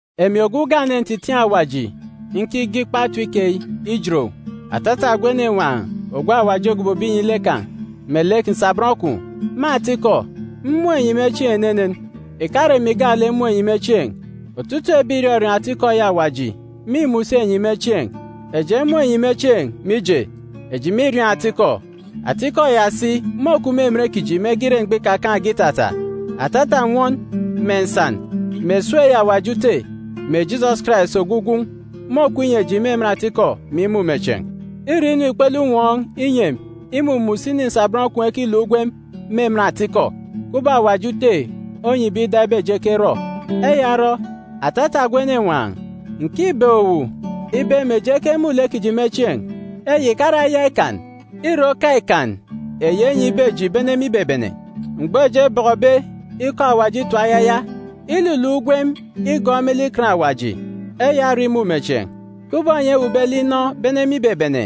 Emi ogwu ugane ntitiin̄ Awaji nkige ikpa etip keyi ijet owu, atata ogwu enenwaan̄ Awaji ogobobe inyi lek kan̄, melek nsabọn kwun̄. Me atikọ, mmun̄ enyi me chieen̄ enenen. Ìkare emi gaalek mmun̄ enyi me chieen̄. Otutuuk ebi ìrọriọọn̄ atikọ eyi Awaji mîmun̄ si enyi me chieen̄. Eji emun̄ enyi me chieen̄, mije, eji mîriọọn̄ atikọ. Atikọ ya si môkup me emen kiji mege ire mgbọ ikakaan̄ge itata. Atata nnwọn, mè nsan, mè esuuk eyi Awaji Ute mè Jisọs Karais ogwu Gwun̄ môkup inyi eji me emen atikọ mè imumechieen̄. Îre inu ikpele unwọọn̄ inyi emi imumun̄ usini nsabọn kwun̄ ekiluk ugwem me emen atikọ, kubọk Awaji Ute onyibe ida ibe eji ekerọ. Eya orọ, atata ogwu enenwaan̄, ǹkibeek owu ibe mè eji ekemun̄ lek kiji me chieen̄. Eyi ìkare aya ikan. Îre oka ikan eyi enyibe eji bene me ibebene, mgbọ eji ebọkọbe ikọ Awaji itap ayaya. Iluluk ugwem igọọk me lek Ikan Awaji, eya ore imumechieen̄. Kubọk enyi ewuukbe lek inọ bene me ibebene,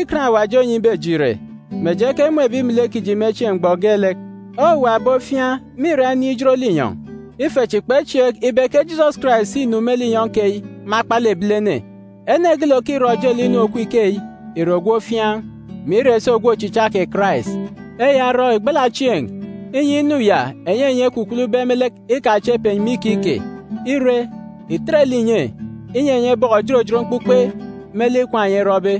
Ikan Awaji onyibe eji ìre, mè eji ekemun̄ ebi melek kiji me chieen̄ mgbọ geelek. Owuwa ebi ofiaan̄ mîra inin̄ ijot linyọn̄. Ife chi kpechieek ibe ke Jisọs Karais înu me linyọn̄ keyi me akpalek ebilene. Ene geelek òkirọ ojelek inu òkup ikeyi ìre ogwu ofiaan̄, mè ire si ogwu ochicha kè Karais. Eya orọ, ìgbala chieen̄, inyi inu ya eyi enyi ekwukwulube me lek ikachep enyi me ikike. Ire, ìtet lek ìnye, inyi enyi ebọkọ òjot òjot mkpukpe me lek ikwaan̄ enyi erọbe.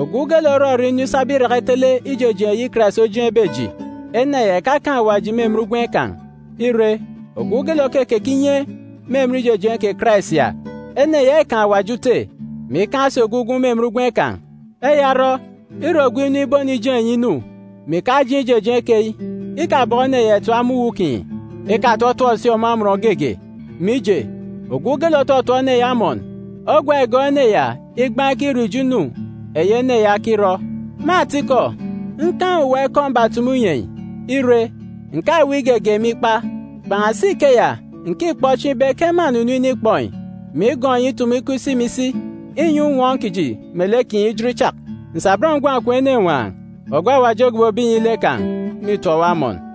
Ogwu geelek òrọrọ inu isaba iraka itele ijejeen̄ eyi Karais ojeen̄be eji, ene ya ìkakaan̄ Awaji me emen ugwem kan̄. Ire, ogwu geelek òkekeke inye me emen ijejeen̄ kè Karais ya, ene ya îkaan̄ Awaji Ute, mè ikaan̄ si ogwu Gwun̄ me emen ugwem kan̄. Eya orọ, ire ogwu inu ibonijeen̄ enyi inu, mè ìkajeen̄ ijejeen̄ keyi, ikabọkọ ene ya ìtap me uwu kinyi. Ikatọtọp si ọmọ amọn geege. Mije, ogwu geelek òtọtọp ene ya amọn, ogwa îgọọk ene ya igbaan̄ ikirọ ijo inu eyi ene ya okirọ. Me atikọ, nkaan̄ owuwa ikọ mbatumu inyi enyi. Ire, ǹkaweek igege me ikpa. Kpan̄asi ikeya, ǹkikpọ chieen̄ ibe ke mânunu inikpọ enyi, mè igọọk enyi itumu ikọ isi mè isi, inyi unwọọn̄ kiji me lek kinyi ijot ichak. Nsabọn ngwan̄ kwun̄ enenwaan̄, ogwu Awaji ogobobe inyi lek kan̄, mîtọp owu amọn.